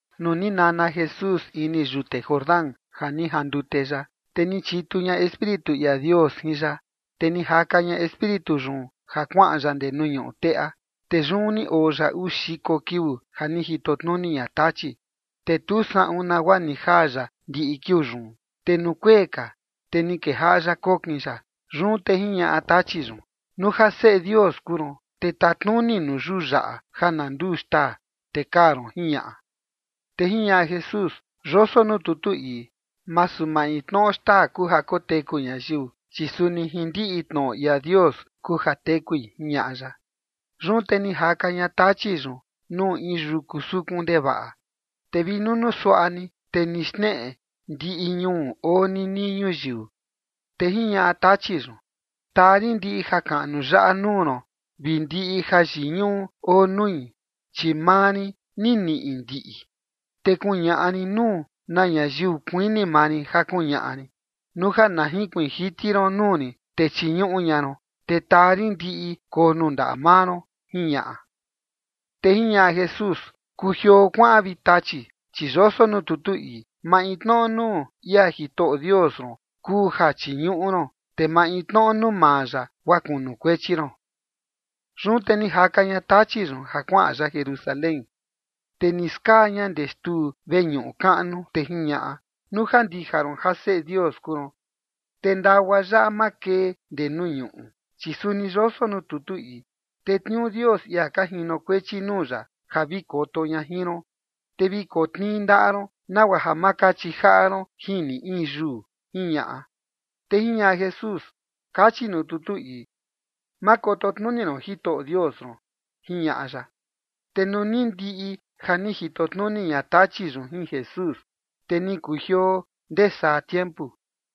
Nuu ni nana Jesús ini yute Jordán ja ni jandute ya, te ni chitu ña Espíritu ia Dios jin ya, te ni jaka ña Espíritu yun ja kuaꞌan ya ndee nuu ñuꞌu teꞌa. Te yun ni oo ya uu xiko kiuu ja ni jito tnuni ña Tachi, te tu saꞌun nagua ni jaa ya ndiꞌi kiuu yun, te nuu kuee ka, te ni kejaꞌa ya kokin ya. Yun te jiñaꞌa Tachi yun: ―Nuu ja Seꞌe Dios kuu ron, te tatnuni nuu yuu yaꞌa ja na nduu xtaa, te kaa ron ―jiñaꞌa. Te jiñaꞌa Jesús: ―Yoso nuu tutu ii: “Masu maintnoꞌo xtaa kuu ja koteku ñayiu, chi suni jin ndiꞌi tnoꞌo ia Dios kuu ja tekui” ―jiñaꞌa ya. Yun te ni jaka ña Tachi yun nuu in yuku sukun ndevaꞌa, te vi nunuu suaꞌa ni, te ni xneꞌe ndiꞌi ñuu oo ninii ñuyiu. Te jiñaꞌa Tachi yun: ―Taa rin ndiꞌi jakaꞌnu yaꞌa nuu ron vi ndiꞌi jayiñuꞌu oo nui, chi maa rin ni niꞌi ndiꞌi, te kuñaꞌa rin nuu na ñayiu kuini maa rin ja kuñaꞌa rin. Nuu ja na jinkuiin jiti ron nuu rin, te chiñuꞌu ña ron, te taa rin ndiꞌi koo nuu ndaꞌa maa ron ―jiñaꞌa. Te jiñaꞌa Jesús: ―Kujioo kuaꞌan, vi Tachi, chi yoso nuu tutu ii: “Maintnoꞌo nuu ia Jitoꞌo Dios ron kuu ja chiñuꞌu ron, te maintnoꞌo nuu maa ya guaa kunukuechi ron”. Yun te ni jaka ña Tachi yun ja kuaꞌan ya Jerusalén, te ni skaa ña ndee xtuu veñuꞌu kaꞌnu, te jiñaꞌa: ―Nuu ja ndija ron ja Seꞌe Dios kuu ron, te ndagua yaꞌa makee ndee nuu ñuꞌu, chi suni yoso nuu tutu ii: “Tetniuu Dios ia ka jinokuechi nuu ya ja vi koto ña jin ron”, te “vi kotnii ndaꞌa ron, nagua ja ma kachi jaꞌa ron jin ni in yuu”, ―jiñaꞌa. Te jiñaꞌa Jesús: ―Kachi nuu tutu ii: “Ma koto tnuni ron Jitoꞌo Dios ron” ―jiñaꞌa ya. Te nuu ni ndiꞌi ja ni jito tnuni ña Tachi yun jin Jesús, te ni kujioo ndee saa tiempu.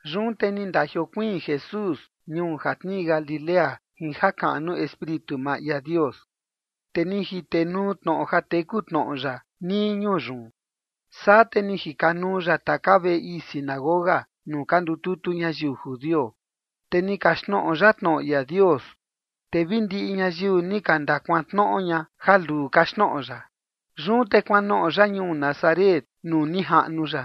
Yun te ni ndajiokuiin Jesús ñuu ja tnii Galilea jin jakaꞌnu Espíritu maa ia Dios. Te ni jitenuu tnoꞌo ja teku tnoꞌo ya nii ñuu yun. Saa te ni jikanuu ya taka veꞌe ii sinagoga nuu ka ndututu ñayiu judio, te ni kaxtnoꞌo ya tnoꞌo ia Dios, te vi ndiꞌi ñayiu ni ka ndakuantnoꞌo ña ja luu kaxtnoꞌo ya. Yun te kuanoꞌo ya ñuu Nazaret nuu ni jaꞌnu ya.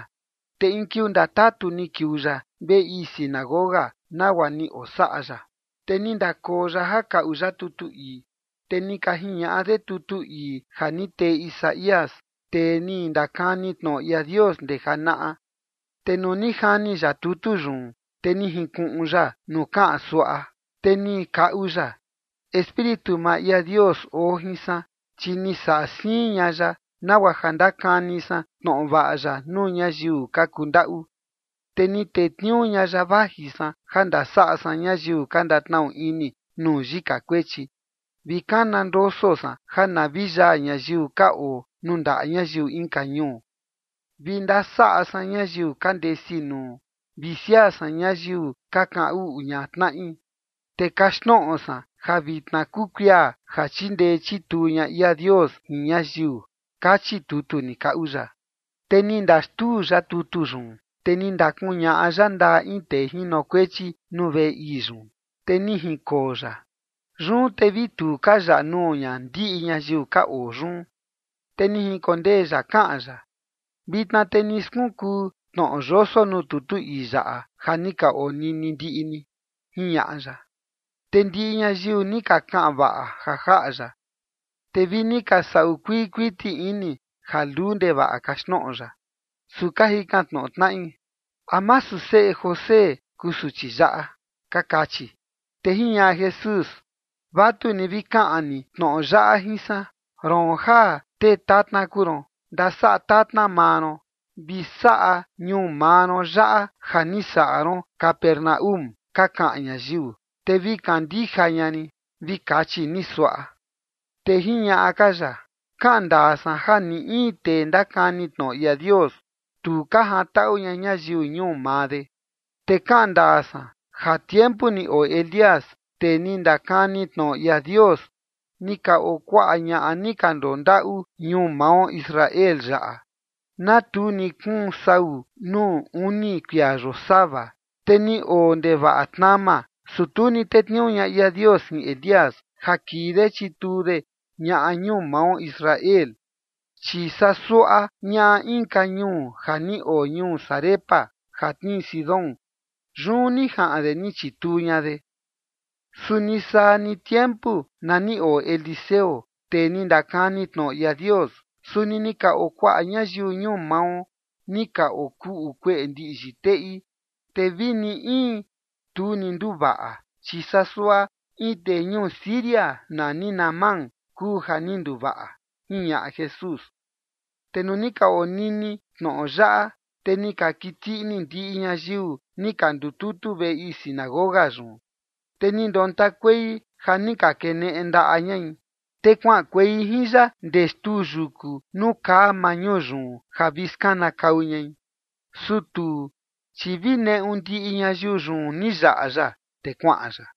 Te in kiuu ndatatu ni kiuu ya veꞌe ii sinagoga, nagua ni osaꞌa ya. Te ni ndakoo ya ja kaꞌu ya tutu ii. Te ni ka jiñaꞌa de tutu ii ja ni tee Isaías, tee ni ndakani tnoꞌo ia Dios ndee janaꞌa. Te nuu ni jani ya tutu yun, te ni jinkuꞌun ya nuu kaꞌan suaꞌa, te ni kaꞌu ya: Espíritu maa ia Dios oo jin san, chi ni saꞌa siin ña ya, nagua ja ndakani san tnoꞌo vaꞌa ya nuu ñayiu ka kundaꞌu. Te ni tetniuu ña ya vaji san ja ndasaꞌa san ñayiu ka ndatnaꞌu ini nuu yika kuechi, vi kana ndoso san ja na vi yaa ñayiu ka oo nuu ndaꞌa ñayiu inka ñuu, vi ndasaꞌa san ñayiu ka ndesi nuu vi siaa san ñayiu ka kaꞌan uꞌu ña tnaꞌi. Te kaxtnoꞌo san ja vitna kuu kuia ja chindee chituu ña ia Dios jin ñayiu kachi tutu ni kaꞌu ya. Te ni ndaxtuu ya tutu yun, te ni ndakuñaꞌa ya ndaꞌa in tee jinokuechi nuu veꞌe ii yun, te ni jinkoo ya. Yun te vi tu ka yaꞌa nuu ña ndiꞌi ñayiu ka oo yun. Te ni jinkondee ya kaꞌan ya: ―Vitna te ni skunkuu tnoꞌo yoso nuu tutu ii yaꞌa ja ni ka onini ndiꞌi ni ―jiñaꞌa ya. Te ndiꞌi ñayiu ni ka kaꞌan vaꞌa ja jaꞌa ya, te vi ni ka saꞌu kuii kuiti ini ja luu ndevaꞌa kaxtnoꞌo ya. Su ka jikan tnoꞌo tnaꞌi: ―¿A masu seꞌe José kuu suchi yaꞌa? ―ka kachi. Te jiñaꞌa Jesús: ―Vatuni vi kaꞌan ni tnoꞌo yaꞌa jin san: “Roon ja tee tatna kuu ron, ndasaꞌa tatna maa ron, vi saꞌa ñuu maa ron yaꞌa ja ni saꞌa ron Capernaúm ka kaꞌan ñayiu, te vi kandija ña rin”, vi kachi ni suaꞌa. Te jiñaꞌa ka ya: ―Kaꞌan ndaa san ja ni in tee ndakani tnoꞌo ia Dios, tu ka jantaꞌu ña ñayiu ñuu maa de. Te kaꞌan ndaa san, ja tiempu ni oo Elías, tee ni ndakani tnoꞌo ia Dios, ni ka oo kuaꞌa ñaꞌa ni ka ndondaꞌu ñuu mao Israel yaꞌa, na tu ni kuun saꞌun sau nuu uni kuia yosava, te ni oo ndevaꞌa tnama, su tu ni tetniuu ña ia Dios jin Elías ja kii de chituu de ñaꞌa ñuu mao Israel, chi saa suaꞌa ñaꞌa inka ñuu ja ni oo ñuu Sarepta ja tnii Sidón, yun ni jaꞌan de ni chituu ña de. Suni saa ni tiempu na ni oo Eliseo, tee ni ndakani tnoꞌo ia Dios, suni ni ka oo kuaꞌa ñayiu ñuu mao ni ka okuꞌu kueꞌe ndiꞌyi teꞌi. Te vini in tu ni nduvaꞌa, chi saa suaꞌa in tee ñuu Siria nani Naamán kuu ja ni nduvaꞌa ―jiñaꞌa Jesús. Te nuu ni ka onini tnoꞌo yaꞌa, te ni ka kiti ini ndiꞌi ñayiu ni ka ndututu veꞌe ii sinagoga yun. Te ni ndontakuei ja ni ka keneꞌe ndaꞌa ñai. Te kuaꞌankuei jin ya ndee xtuu yuku nuu kaa maa ñuu yun, ja vi skanakau ñai. Su tuu, chi vi neꞌu ndiꞌi ñayiu yun ni yaꞌa ya, te kuaꞌan ya.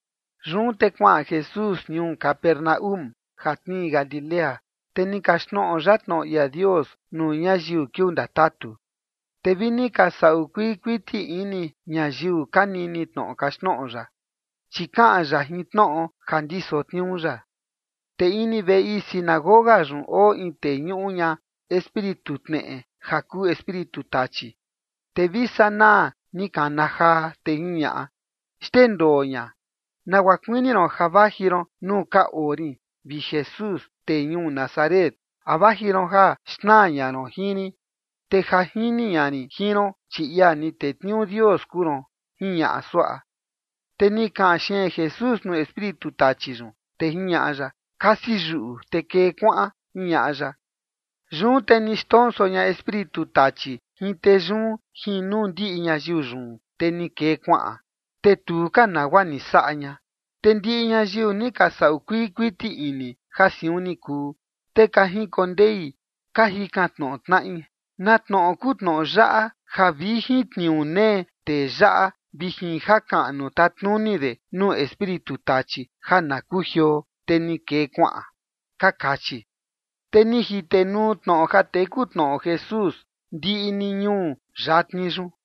Yun te kuaꞌan Jesús ñuu Capernaúm ja tnii Galilea. Te ni okaxtnoꞌo ya tnoꞌo ia Dios nuu ñayiu kiuu ndatatu. Te vi ni ka saꞌu kuii kuiti ini ñayiu ka nini tnoꞌo kaxtnoꞌo ya, chi kaꞌan ya jin tnoꞌo ja ndiso tniuu ya. Te ini veꞌe ii sinagoga yun oo in tee ñuꞌu ña espíritu tneꞌe ja kuu espíritu tachi, te vi sanaa ni kana jaa, te jiñaꞌa: ―Xndendoo ña. ¿Nagua kuini ron ja vaji ron nuu ka oo rin, vi Jesús, tee ñuu Nazaret? ¿A vaji ron ja xnaa ña ron jin rin? Te ja jini ña rin jin ron, chi ia ni tetniuu Dios kuu ron ―jiñaꞌa suaꞌa. Te ni kaꞌan xeen Jesús nuu espíritu tachi yun, te jiñaꞌa ya: ―Kasi yuꞌu, te kee kuaꞌan ―jiñaꞌa ya. Yun te ni xndonso ña espíritu tachi jin tee yun jin nuu ndiꞌi ñayiu yun, te ni kee kuaꞌan. Te tu ka nagua ni saꞌa ña. Te ndiꞌi ñayiu ni ka saꞌu kuii kuiti ini ja siun ni kuu, te ni ka jinkondei ka jikan tnoꞌo tnaꞌi: ―¿Na tnoꞌo kuu tnoꞌo yaꞌa ja vi jin tniuu nee tee yaꞌa vi jin jakaꞌnu tatnuni de nuu espíritu tachi ja na kujioo, te ni kee kuaꞌan? ―ka kachi. Te ni jitenuu tnoꞌo ja teku tnoꞌo Jesús ndiꞌi ni ñuu yatni yun.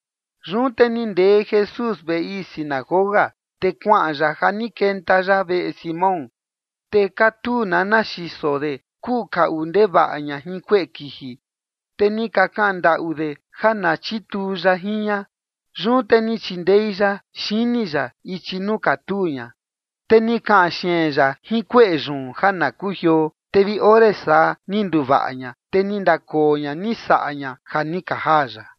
Yun te ni ndee Jesús veꞌe ii sinagoga, te kuaꞌan ya ja ni kenta ya veꞌe Simón. Te katuu nana xiso de kuꞌu kaꞌu ndevaꞌa ña jin kueꞌe kiji, te ni ka kaꞌan ndaꞌu de ja na chituu ya jin ña. Yun te ni chindei ya xini ya ichi nuu katuu ña, te ni kaꞌan xeen ya jin kueꞌe yun ja na kujioo. Te vi ore saa, ni nduvaꞌa ña, te ni ndakoo ña ni saꞌa ña ja ni ka jaa ya.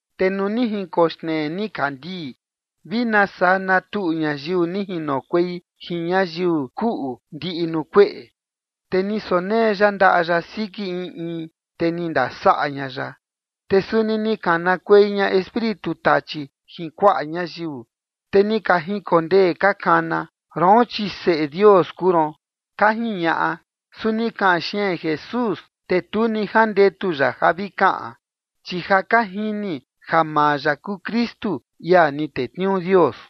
Te nuu ni jinkoxnee nikandii, vi nasaa natuꞌu ñayiu ni jinokuei jin ñayiu kuꞌu ndiꞌi nuu kueꞌe, te ni sonee ya ndaꞌa ya siki in in, te ni ndasaꞌa ña ya. Te suni ni kanakuei ña espíritu tachi jin kuaꞌa ñayiu, te ni ka jinkondee ka kana: ―Roon, chi Seꞌe Dios kuu ron ―ka jiñaꞌa. Su ni kaꞌan xeen Jesús, te tu ni jandetu ya ja vi kaꞌan, chi ja ka jini ja maa ya kuu Kristu, ia ni tetniuu Dios.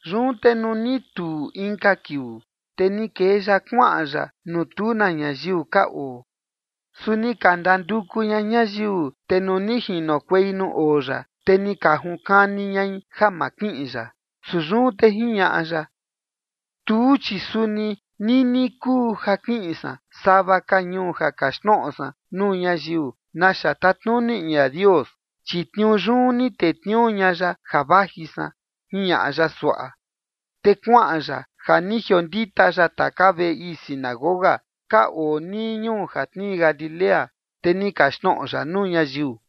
Yun te nuu ni tuu inka kiuu, te ni kee ya kuaꞌan ya nuu tu na ñayiu ka oo. Su ni ka ndanduku ña ñayiu, te nuu ni jinokuei nuu oo ya, te ni ka junkani ñai ja ma kiꞌin ya. Su yun te jiñaꞌa ya: ―Tuu, chi suni nini kuu ja kiꞌin san sava ka ñuu ja kaxtnoꞌo san nuu ñayiu naxa tatnuni ia Dios, chi tniuu yun ni tetniuu ña ya ja vaji san ―jiñaꞌa ya suaꞌa. Te kuaꞌan ya ja ni jiondita ya taka veꞌe ii sinagoga ka oo nii ñuu ja tnii Galilea, te ni kaxtnoꞌo ya nuu ñayiu.